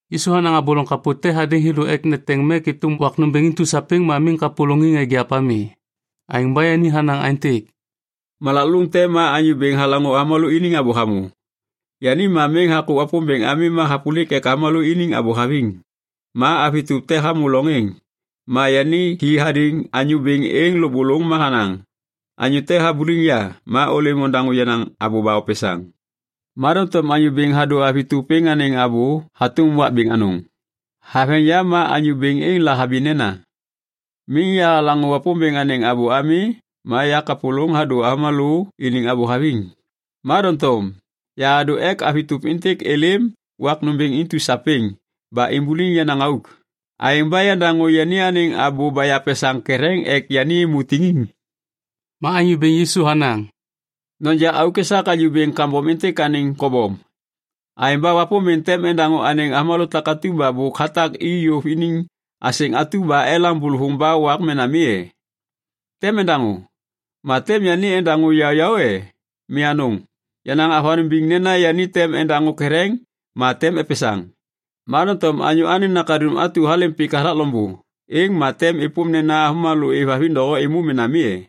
Yisu hanaŋ abô loŋ kapô te hadêŋ thêlô ek neteŋ mek êtôm wak nômbêŋ intu sapêŋ ma miŋ kapôlôŋiŋ eŋgiap ami. Aêŋ ba yani hanaŋ aêntêk, “Malak lôŋ te ma anyô bêŋ halaŋô avômalô iniŋ abô hamô. Yani ma miŋ hakô Wapômbêŋ ami ma hapôlik ek avômalô iniŋ abô haviŋ. Ma avi tôp te hamô lôŋ êŋ. Ma yani hi hadêŋ anyô bêŋ êŋ lôbôlôŋ ma hanaŋ, ‘Anyô te habuliŋ ya. Ma ôlêm ondaŋô yenaŋ abô ba opesaŋ.’ Ma doŋtom anyô bêŋ hadô avi tôp êŋ anêŋ abô hatôm wak bêŋ anôŋ. “Haveŋ yam ma anyô bêŋ êŋ lahabi nena, ‘Miŋ yahalaŋô Wapômbêŋ anêŋ abô ami ma yakapôlôŋ hadô avômalô iniŋ abô haviŋ, ma doŋtom yahadô ek avi tôp êntêk êlêm wak nômbêŋ intu sapêŋ ba imbuliŋ yenaŋ auk. Aêŋ ba yandaŋô yani anêŋ abô ba yapesaŋ ketheŋ ek yani êmô tiŋiŋ.’” Ma Anyô Bêŋ Yisu hanaŋ, “Noja auk esak anyô bêŋ kambom êntêk anêŋ kobom. Aêŋ ba Wapômbêŋ tem endaŋô anêŋ avômalô takatu ba bôk hatak i yôv iniŋ asêŋ atu ba elaŋ bôlôvôŋ ba wak mena mi e? Tem endaŋô. Ma tem yani endaŋô yaôyaô e? Mi anôŋ! Yanaŋ avanôŋ biŋ nena yani tem endaŋô ketheŋ ma tem epesaŋ. Ma doŋtom Anyô Anêŋ Nakaduŋ atu halêm pik hathak loŋbô, êŋ ma tem êpôm nena avômalô êvhaviŋ doho êmô mena mi e?”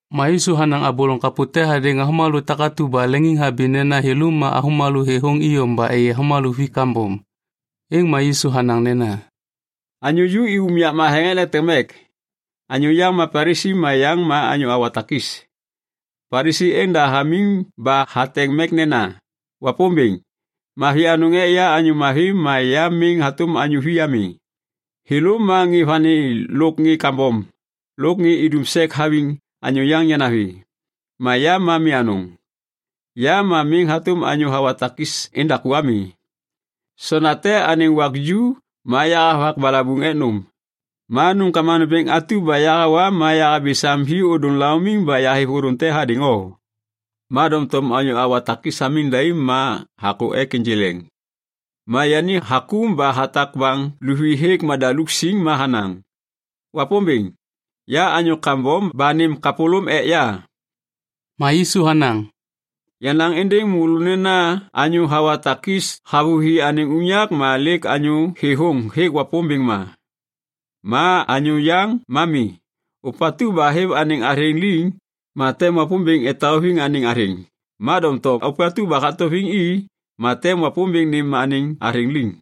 Ma Yisu hanaŋ abô loŋ kapô te hadêŋ avômalô takatu ba leŋiŋhabi nena thêlô ma avômalô thêthôŋ iyom ba êyê avômalô vi kambom. Êŋ ma Yisu hanaŋ nena, “Anyô ju i unyak matheŋ ek neteŋ mek. Anyô yaŋ ma Palisi ma yaŋ ma anyô hawa takis. Palisi êŋ da hamiŋ ba hateŋ mek nena, ‘Wapômbêŋ, mavi anôŋ ek ya anyô mavi ma ya miŋ hatôm anyô vi ami. Thêlô ma ŋê vani lôk ŋê kambom lôk ŋê idum sek haviŋ anyô yaŋ yanavi. Ma ya ma mi anôŋ, ya ma miŋ hatôm anyô hawa takis endaku ami. Sonda te anêŋ wak ju ma yahavak balabuŋ ek nôm. Ma nômkama nômbêŋ atu ba yahawa ma yahabi sam hi ôdôŋ laumiŋ ba yahêv ôdôŋ te hadêŋ o.’ “Ma doŋtom anyô hawa takis hamiŋ daim ma hakô ek ênjê leŋ. Ma yani hakôm ba hatak baŋ luvi hêk madaluk siŋ ma hanaŋ, ‘Wapômbêŋ, ya anyô kambom ba nêm kapôlôm ek ya.’” Ma Yisu hanaŋ, “Yanaŋ êndêŋ môlô nena anyô hawa takis havôhi anêŋ unyak ma lêk anyô thêthôŋ hêk Wapômbêŋ ma. Ma anyô yaŋ ma mi. Ôpatu ba hêv anêŋ athêŋ liŋ ma tem Wapômbêŋ etauviŋ anêŋ athêŋ. Ma doŋtom ôpatu ba hatauviŋ i ma tem Wapômbêŋ nêm anêŋ athêŋ liŋ.”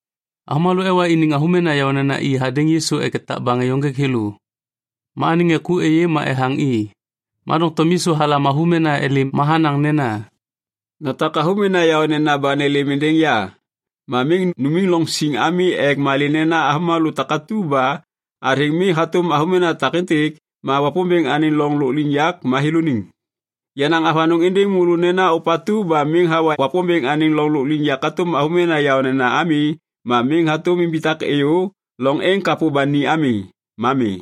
Avômalô ewa iniŋ avômena yaônena i hadêŋ Yisu ek etak baŋ êyô ênjêk thêlô. Ma anêŋ ŋê ku êyê ma ethaŋ i. Ma doŋtom Yisu halam avômena êlêm ma hanaŋ nena, “Notak avômena yaônena ba nêlêm êndêŋ ya ma miŋ numiŋ loŋ siŋ ami ek malê nena avômalô takatu ba athêŋ mi hatôm avômena takêntêk ma Wapômbêŋ anêŋ loŋ lôkliŋyak ma thêlôniŋ. Yanaŋ avanôŋ êndêŋ môlô nena ôpatu ba miŋ hawa Wapômbêŋ anêŋ loŋ lôkliŋyak hatôm avômena yaônena ami ma miŋ hatôm imbitak êyô loŋ êŋ kapô ba ni ami. Ma mi.”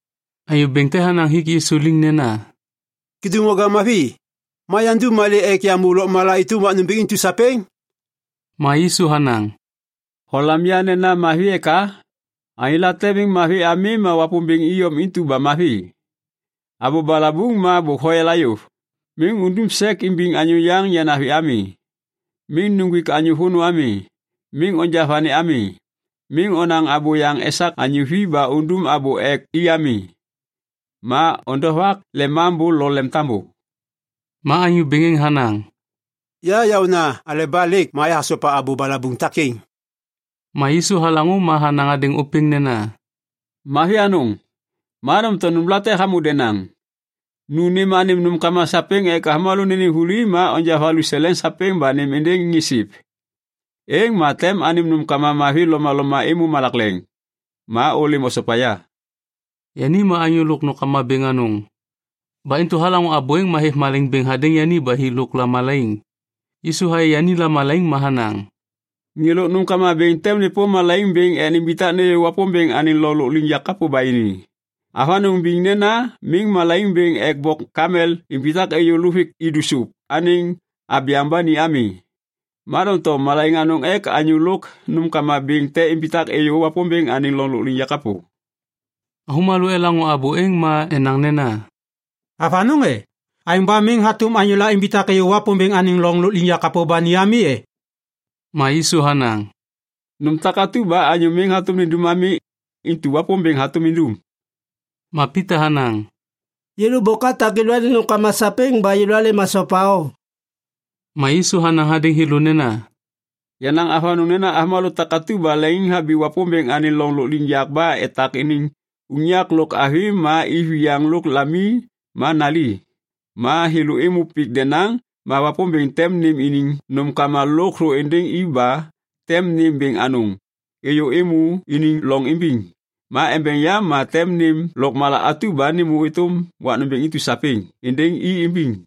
Anyô bêŋ te hanaŋ hik Yisu liŋ nena, “Kêdôŋwaga mavi, ma yandum malê ek yamô lôkmala êtôm wak nômbêŋ intu sapêŋ?” Ma Yisu hanaŋ, “Holam ya nena mavi eka? Anyô late miŋ mavi ami ma Wapômbêŋ iyom intu ba mavi. Abô balabuŋ ma bôk hoyala yôv: ‘Miŋ undum sek imbiŋ anyô yaŋ yanavi ami. Miŋ nuŋgwik anyô vônô ami. Miŋ onja vani ami. Miŋ onaŋ abôyaŋ esak anyô vi ba undum abô ek i ami. Ma ondovak lemambô lo lemtambô.’” Ma anyô bêŋ êŋ hanaŋ, “Ya yaôna aleba lêk ma yahasopa abô balabuŋ takêŋ.” Ma Yisu halaŋô ma hanaŋ hadêŋ ôpêŋ nena, “Mavi anôŋ, ma doŋtom nômlate hamô denaŋ. Nu nêm anêm nômkama sapêŋ ek avômalô nênêm vuli ma onja valuseleŋ sapêŋ ba nêm êndêŋ ŋê siv. Êŋ ma tem anêm nômkama mavi lomaloma êmô malak leŋ. Ma ôlêm osopa ya.” Yani ma anyô lôk nômkama bêŋ anôŋ. Ba intu halaŋô abô êŋ ma hêv malaiŋ bêŋ hadêŋ yani ba hi lôk lamalaiŋ. Yisu hayê yani lamalaiŋ ma hanaŋ, “Ŋê lôk nômkama bêŋ tem nêpôm malaiŋ bêŋ ek nimbitak nêyô Wapômbêŋ anêŋ loŋ lôkliŋyak kapô ba ini. Avanôŋ biŋ nena miŋ malaiŋ bêŋ ek bok kamel imbitak êyô luvik idu sôp anêŋ abyaŋ ba ni ami, ma doŋtom malaiŋ anôŋ ek anyô lôk nômkama bêŋ te imbitak êyô Wapômbêŋ anêŋ loŋ lôkliŋyak kapô.” Avômalô elaŋô abô êŋ ma enaŋ nena, “Avanôŋ e? Aêŋ ba miŋ hatôm anyôla imbitak êyô Wapômbêŋ anêŋ loŋ lôkliŋyak kapô ba ni ami e?” Ma Yisu hanaŋ, “Nôm takatu ba anyô miŋ hatôm nindum ami, intu Wapômbêŋ hatôm indum.” Ma Pita hanaŋ, “Yêlô bôk atak yêlôaniŋ nômkama sapêŋ ba alêm asopa o.” Ma Yisu hanaŋ hadêŋ thêlô nena, “Yanaŋ avanôŋ nena avômalô takatu ba leŋiŋhabi Wapômbêŋ anêŋ loŋ lôkliŋyak ba etak iniŋ unyak lo avi ma iviyaŋ lôk lami ma nali, ma thêlô êmô pik denaŋ ma Wapômbêŋ tem nêm iniŋ nômkama lôkthô êndêŋ i ba tem nêm bêŋ anôŋ êyô êmô iniŋ loŋ imbiŋ ma embeŋ yam ma tem nêm lôkmala atu ba nêmô êtôm wak nômbêŋ intu sapêŋ êndêŋ i imbiŋ.”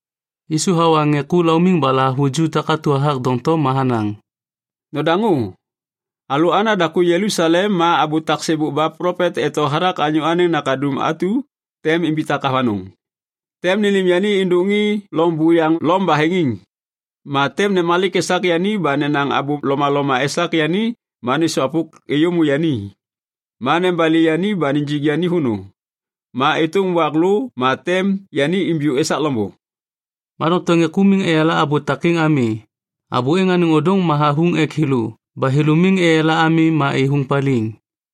Yisu hawa ŋê ku laumiŋ ba lahavuju takatu hathak doŋtom ma hanaŋ, “Nodaŋô. Alalô ana daku Jelusalem ma abô tak sêbôk ba plopet eto hathak Anyô Anêŋ Nakaduŋ atu tem imbitak avanôŋ. Tem nênêm yani êndôk ŋê loŋ buyaŋ Lom baheŋiŋ. Ma tem nemalik esak yani ba nenaŋ abô lomaloma esak yani ma nêsôvwapôk êyômô yani. Ma nebali yani ba nijik yani vônô. Ma êtôm wak lô ma tem yani imbiyô esak loŋbô.” Ma doŋtom ŋê ku miŋ eyala abô takêŋ ami. Abô êŋ anêŋ ôdôŋ ma havuŋ ek thêlô ba thêlô miŋ eyala ami ma êthôŋ paliŋ.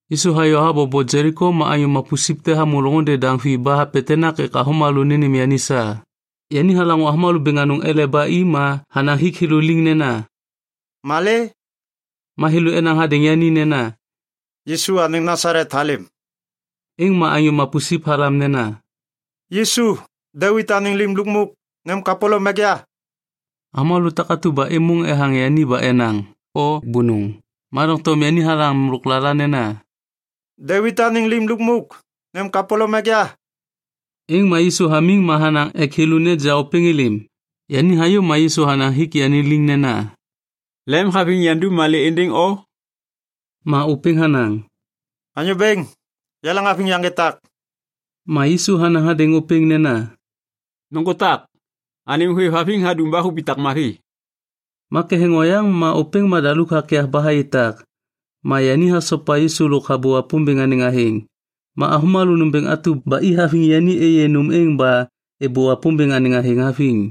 Yisu hayô habobo Jeliko ma anyô mapusip te hamô loŋôndê daŋ vi ba hapetenak ek avômalô nênêm yani sa. Yani halaŋô avômalô bêŋ anôŋ ele ba i ma hanaŋ hik thêlô liŋ nena, “Malê?” Ma thêlô enaŋ hadêŋ yani nena, “Yisu anêŋ Nasalet halêm.” Êŋ ma anyô mapusip halam nena, “Yisu, Devit anêŋ Lim Lukmuk, nêm kapôlôm ek ya!” Avômalô takatu ba êmôŋ ethaŋ yani ba enaŋ, “O bônôŋ.” Ma doŋtom yani halam lôklala nena, “Devit anêŋ Lim Lukmuk, nêm kapôlôm ek ya!” Êŋ ma Yisu hamiŋ ma hanaŋ ek thêlô neja ôpêŋ êlêm. Yani hayô ma Yisu hanaŋ hik yani liŋ nena, “Lemhaviŋ yandum malê êndêŋ o?” Ma ôpêŋ hanaŋ, “Anyô Bêŋ, yaleŋhaviŋ yaŋgê tak.” Ma Yisu hanaŋ hadêŋ ôpêŋ nena, “Nôŋgô tak. Anêm hôêvhaviŋ hadum ba hubitak mavi.” Ma ketheŋ oyaŋ ma ôpêŋ madaluk hakyav ba hayê tak. Ma yani hasopa Yisu lôk habô Wapômbêŋ anêŋ athêŋ. Ma avômalô nômbêŋ atu ba i haviŋ yani êyê nôm êŋ ba êbô Wapômbêŋ anêŋ athêŋ haviŋ.